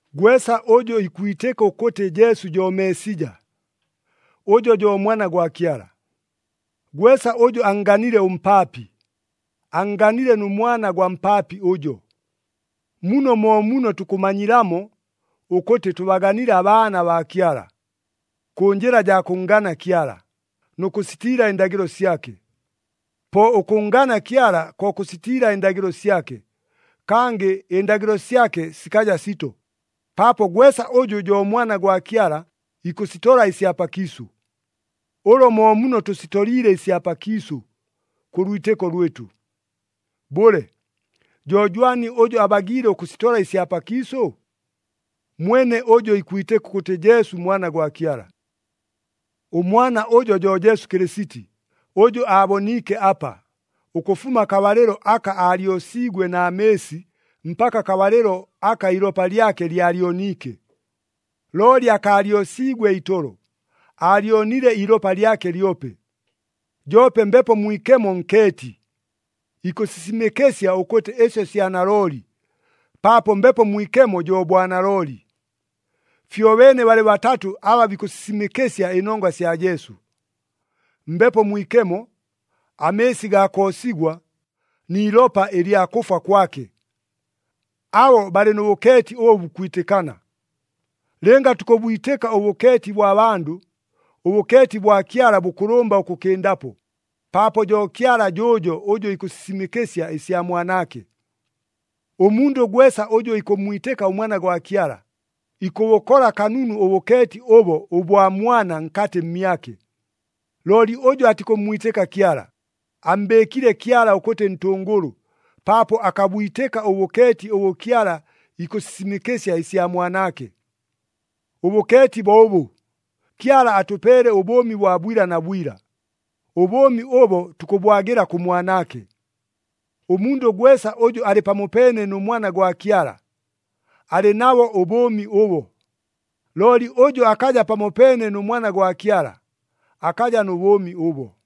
Gwesa ʉjʉ ikwitɨka ʉkʉtɨ Jesu jo Meesija, ʉjo jo Mwana gwa Kyala. Gwesa ʉjʉ annganile ʉmpaapi, annganile nʉ mwana gwa mpaapi ʉjo. Muno mo muno tukʉmanyilamo ʉkʉtɨ tʉbaganile abaana baa Kyala. Kʉ njɨla jaa kʉnngana Kyala, nʉ kʉsitiila ɨndagɨlo syake. Po ʉkʉnngana Kyala ko kʉsitiila ɨndagɨlo syake, kangɨ ɨndagɨlo syake sikaja sito, paapo gwesa ʉjʉ jo mwana gwa Kyala, ikʉsitola ɨsya pakiisʉ. Ʉlo mo muno tʉsitoliile ɨsya pakiisʉ, kʉ lwitɨko lwɨtʉ. Bʉle, jo jwani ʉjʉ abagiile ʉkʉsitola ɨsya pakiisʉ? Mwene ʉjʉ ikwitɨka ʉkʉtɨ Jesu Mwana gwa Kyala. ɄMwana ʉjo jo Jesu Kɨlɨsiti, ʉjʉ aaboniike apa, ʉkʉfuma akabalɨlo aka aalyosiigwe na mɨɨsi mpaka akabalɨlo aka iilopa lyake lyalyoniike. Looli akaalyosiigwe itolo, aalyonile iilopa lyake lyope. Joope Mbepo Mwikemo nkeeti, ikʉsisimɨkɨsya ʉkʉtɨ ɨsyo sya nalooli, paapo Mbepo Mwikemo jo bwanalooli. Fyobeene balɨ batatʉ aba bikʉsisimɨkɨsya ɨnongwa sya Jesu. Mbepo Mwikemo, amɨɨsi gaa koosigwa, ni ilopa ɨlya kʉfwa kwake. Abo balɨ nʉ bʉkeeti ʉbʉ bukwitɨkana. Lɨnga tukʉbwitɨka ʉbʉkeeti bwa bandʉ, ʉbʉkeeti bwa Kyala bʉkʉlʉmba ʉkʉkɨndapo, paapo jo Kyala jʉʉjo ʉjʉ ikʉsisimɨkɨsya ɨsya Mwanaake. Ʉmundʉ gwesa ʉjʉ ikʉmmwitɨka ʉMwana gwa Kyala, ikʉbʉkola kanunu ʉbʉkeeti ʉbo ʉbwa Mwana nkatɨ mmyake. Looli ʉjʉ atikʉmmwitɨka Kyala, ammbɨɨkile Kyala ʉkʉtɨ ntʉngʉlʉ, paapo akabwitɨka ʉbʉkeeti ʉbʉ Kyala ikʉsisimɨkɨsya ɨsya Mwanaake. Ʉbʉkeeti bo ʉbʉ, Kyala atʉpeele ʉbʉʉmi bwa bwila na bwila, ʉbʉʉmi ʉbo tukʉbwagɨla kʉ Mwanaake. Ʉmundʉ gwesa ʉjʉ alɨ pamopeene nʉ Mwana gwa Kyala, alɨ nabo ʉbʉʉmi ʉbo. Looli ʉjʉ akaja pamopeene nʉ Mwana gwa Kyala, akaja nʉ bʉʉmi ʉbo.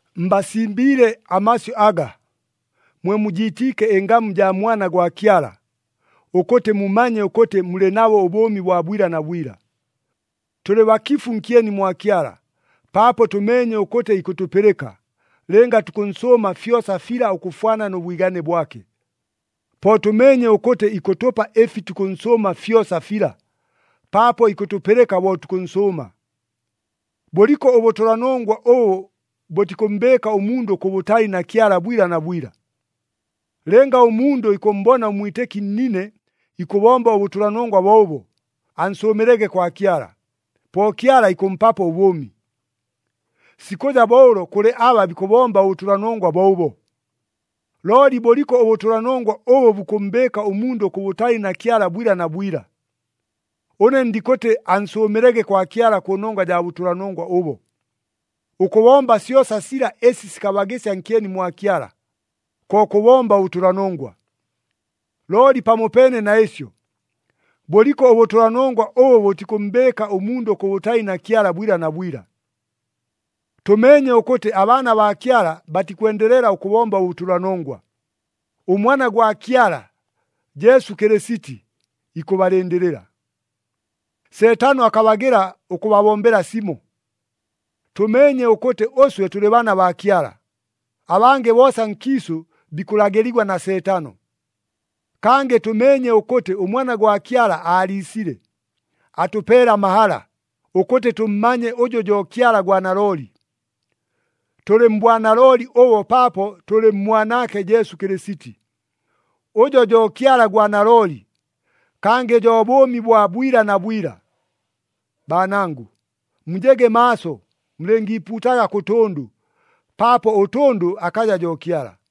Mbasimbiile amasyʉ aga, mwe mujiitiike ɨngamu jaa Mwana gwa Kyala, ʉkʉtɨ mumanye ʉkʉtɨ mulɨ nabo ʉbʉʉmi bwa bwila na bwila. Tʉlɨ bakifu nkyeni mwa Kyala, paapo tʉmeenye ʉkʉtɨ ikʉtʉpɨlɨka, lɨnga tukʉnsʉʉma fyosa fila ʉkʉfwana nʉ bwigane bwake. Po tʉmeenye ʉkʉtɨ ikʉtʉpa ɨfi tukʉnsʉʉma fyosa fila, paapo ikʉtʉpɨlɨka bo tukʉnsʉʉma. Bʉliko ʉbʉtʉlanongwa ʉbʉ bʉtikʉmmbɨɨka ʉmundʉ kʉbʉtali na Kyala bwila na bwila. Lɨnga ʉmundʉ ikʉmmbona ʉmwitɨki nnine ikʉbomba ʉbʉtʉlanongwa bo ʉbo, ansʉʉmɨlege kwa Kyala, po Kyala ikʉmpapo ʉbʉʉmi. Sikʉja bo ʉlo kʉlɨ aba bikʉbomba ʉbʉtʉlanongwa bo ʉbo. Looli bʉliko ʉbʉtʉlanongwa ʉbʉ bukʉmmbɨɨka ʉmundʉ kʉbʉtali na Kyala bwila na bwila. Ʉne ndikʉtɨ ansʉʉmɨlege kwa Kyala kʉnongwa jaa bʉtʉlanongwa ʉbo. Ʉkʉbomba syosa sila ɨsi sikabagɨsya nkyeni mwa Kyala, ko kʉbomba ʉbʉtʉlanongwa. Looli pamopeene na ɨsyo, bʉliko ʉbʉtʉlanongwa ʉbʉ bʉtikʉmmbɨɨka ʉmundʉ kʉbʉtali na Kyala bwila na bwila. Tʉmeenye ʉkʉtɨ abaana baa Kyala batikwendelela ʉkʉbomba ʉbʉtʉlanongwa. ɄMwana gwa Kyala, Jesu Kɨlɨsiti, ikʉbalɨndɨlɨla. Seetano akabagɨla ʉkʉbabombela simo. Tʉmeenye ʉkʉtɨ ʉswe tʉlɨ baana baa Kyala, abangɨ boosa nkiisʉ bikʉlagɨligwa na Seetano. Kangɨ tʉmeenye ʉkʉtɨ ʉMwana gwa Kyala aaliisile, atʉpeele amahala, ʉkʉtɨ tʉmmanye ʉjʉ jo Kyala gwa nalooli. Tʉlɨ mbwanalooli ʉbo paapo tʉlɨ mMwanaake Jesu Kɨlɨsiti. Ʉjo jo Kyala gwa nalooli, kangɨ jo bʉʉmi bwa bwila na bwila. Baanangʉ, mujege maaso mulɨngiipuutaga kʉ tʉndʉ, paapo ʉtʉndʉ akaja jo Kyala.